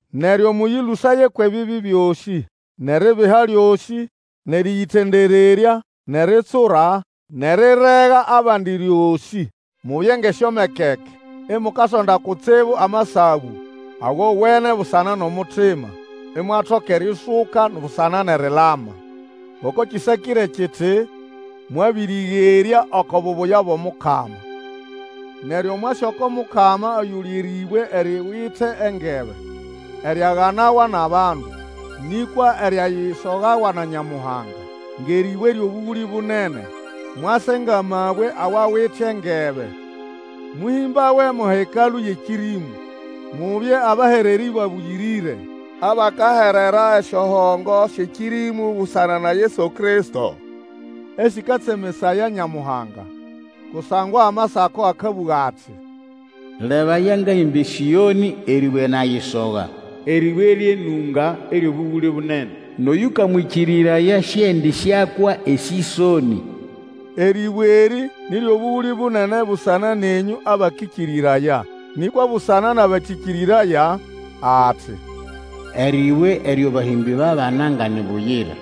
Neryo mũyĩlũsaye kwʼebibi byosĩ, nʼeribiha lyosĩ, nʼerĩyĩtendererya, nʼeritsura, nʼerirega abandi ryosĩ. Mubye ngʼesyomekeke, imukasonda kutsibu amasabũ agowene busana nʼomutima, imwatoka eriusuka busana nʼerilama. Ngoko kĩsakĩre kiti, Mwabĩrĩgerya oko bubuya bwʼomukama. Neryo mwase oko Mukama oyuli erĩbwe eriwite engebe, eryaganawa nʼabandu, nĩkwa eryayisogawa na Nyamuhanga, ngʼerĩbwe eryʼobũgũlĩ bunene. Mwase ngʼamabwe awawite engebe, mũhĩmbawe mo hekalũ yʼekĩrĩmũ, mubye abahererĩ babũyĩrĩre, abakaherera esyohongo syʼekĩrĩmũ busana na Yesu Kristo, esĩkatsemesaya Nyamuhanga. Kusangwa Amasako akabũga ati, Lebaya ngahĩmba eSĩonĩ, erĩbwe nayisoga, Erĩbwe ryʼenũnga, eryʼobũgũlĩ bunene, Nʼoyũkamwĩkĩrĩraya sĩendĩsyakwa esĩsonĩ. Erĩbwe erĩ, nĩ ryʼobũgũlĩ bunene busana nenyũ abakĩkĩrĩraya. Nĩkwa busana nʼabatĩkĩrĩraya, ati, Erĩbwe eryo bahĩmbĩ babana nga ni buyira,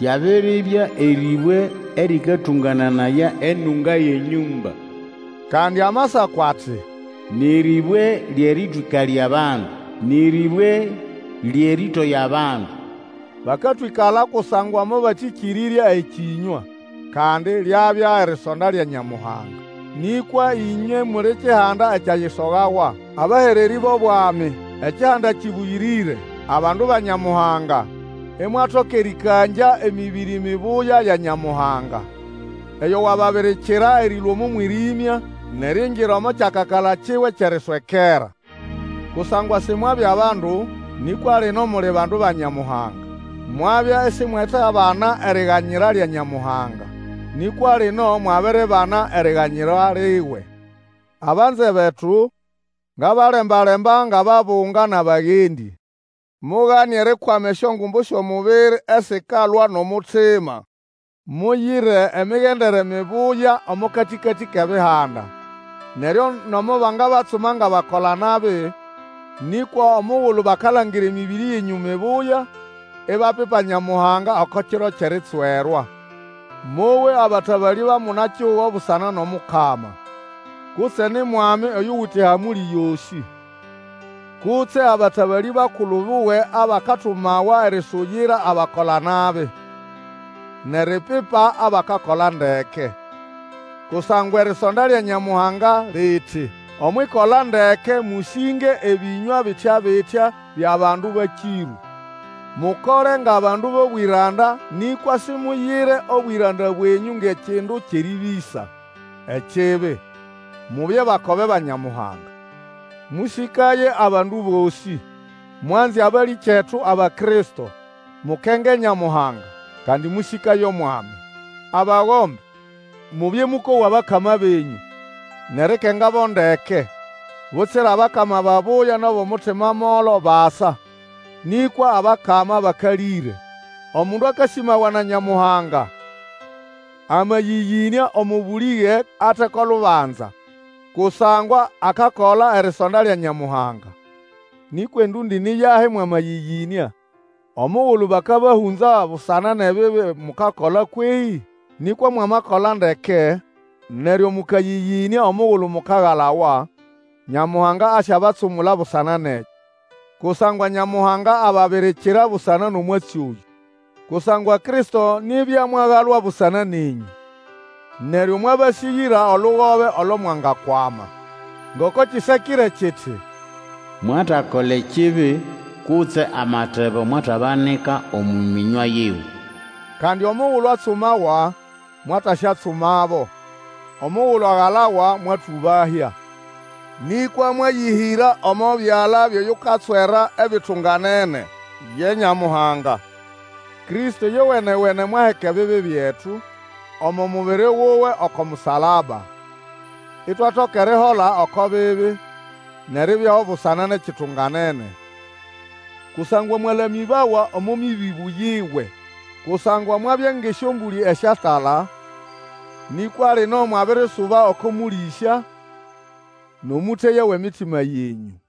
Lyabiribya erĩbwe erĩkatũngananaya enũnga yʼenyũmba. Kandi Amasako ati, Nĩ rĩbwe lyʼerĩtwĩkalya abandu, Nĩ rĩbwe lyʼerĩtoya abandu. Bakatwĩkala kusangwa mobatĩkĩrĩrya ekĩnywa; kandi lyabya erisonda lya Nyamuhanga. Nĩkwa ĩnywe muli kihanda ekyayisogawa, abahererĩ bʼobwami, ekihanda kĩbũyĩrĩre, abandu ba Nyamuhanga, imwatoka erĩkangya emĩbĩrĩ mibuya ya Nyamuhanga, oyo wababirikira erĩlũa omo mwĩrĩmya nʼeriingira omo kyakakala kiwe kyʼeriswekera. Kusangwa Simwabya bandu, nĩkwa lino muli bandu ba Nyamuhanga; mwabya isimwetabana eriganyira lya Nyamuhanga, nĩkwa lino mwabiribana eriganyira liwe. Abanze betu, ngabalemba-lemba ngʼababunga nʼabagendĩ, mugane erikwama esyongumbu syʼomubiri esikalwa nʼomutima. Muyire emigendere mibuya omo katĩkatĩ kʼEbihanda, neryo nomo bangabatsuma ngʼabakola-nabi, nĩkwa omugulu bakalangira emĩbĩrĩ yenyũ mibuya, ibapipa Nyamuhanga oko kiro kyʼeritswerwa. Mowe abatabalĩ ba muna-kihugo busana nʼOmukama, kutse ni mwami oyuwite ehamũlĩ yosĩ, kutse abatabalĩ bakulu buwe abakatumawa erisuyira abakola-nabi nʼeripipa abakakola ndeke. Kusangwa erisonda lya Nyamuhanga liti omwʼikola ndeke mũsĩnge ebĩnywa bitya-bitya byʼabandu bakĩrũ. Mukole ngʼabandu bʼobwĩranda nĩkwa Simuyire obwĩranda bwenyũ ngʼekindu kyʼerĩbĩsa ekibi, mubye bakobe ba Nyamuhanga. Mũsĩkaye abandu bosĩ. Mwanze abalĩkyetu Abakristo, mukenge Nyamuhanga, kandi mũsĩkaye omwami. Abagombe, mubye mũkowa abakama benyũ nʼerikengabo ndeke, butsira abakama babuya nʼabʼomutima molo basa, nĩkwa abakama bakalĩre. Omundu akasĩmawa na Nyamuhanga amayĩyĩnĩa omo bulĩge ate ko lubanza, kusangwa akakola erisonda lya Nyamuhanga. Nĩkwa endũndĩ ni yahi mwamayĩyĩnĩa omugulu bakabahũnza busana nʼebibi mukakola kwehĩ? Nĩkwa mwamakola ndeke, neryo mũkayĩyĩnĩa omugulu mukagalawa, Nyamuhanga asyabatsumula busana nʼekyo. Kusangwa Nyamuhanga ababirikira busana nʼomwatsi oyũ. Kusangwa Kristo nibya mwagalwa busana nenyũ, neryo mwabasĩgĩra olugobe olo mwangakwama. Ngoko kĩsakĩre kiti, Mwatakola ekibi, kutse amatebo mwatabanika omo mĩnywa yiwe. Kandi omugulu atsumawa, mwataswatsumabo, omugulu agalawa mwatũbahya, nĩkwa mwayĩhĩra omo byala byʼoyukatswera ebitunganene, ye Nyamuhanga. Kristo ĩyowene-wene mwaheka ebibi byetu omo mubiri wuwe oko musalaba, itwatoka erihola oko bibi, nʼeribyaho busana nʼekitunganene; kusangwa mwalamĩbawa omo mĩbĩbũ yiwe. Kusangwa mwabya ngʼesyombũlĩ esyatala, nĩkwa lino mwabirisuba oko Mũlĩsya nʼomũteya wʼemitima yenyũ.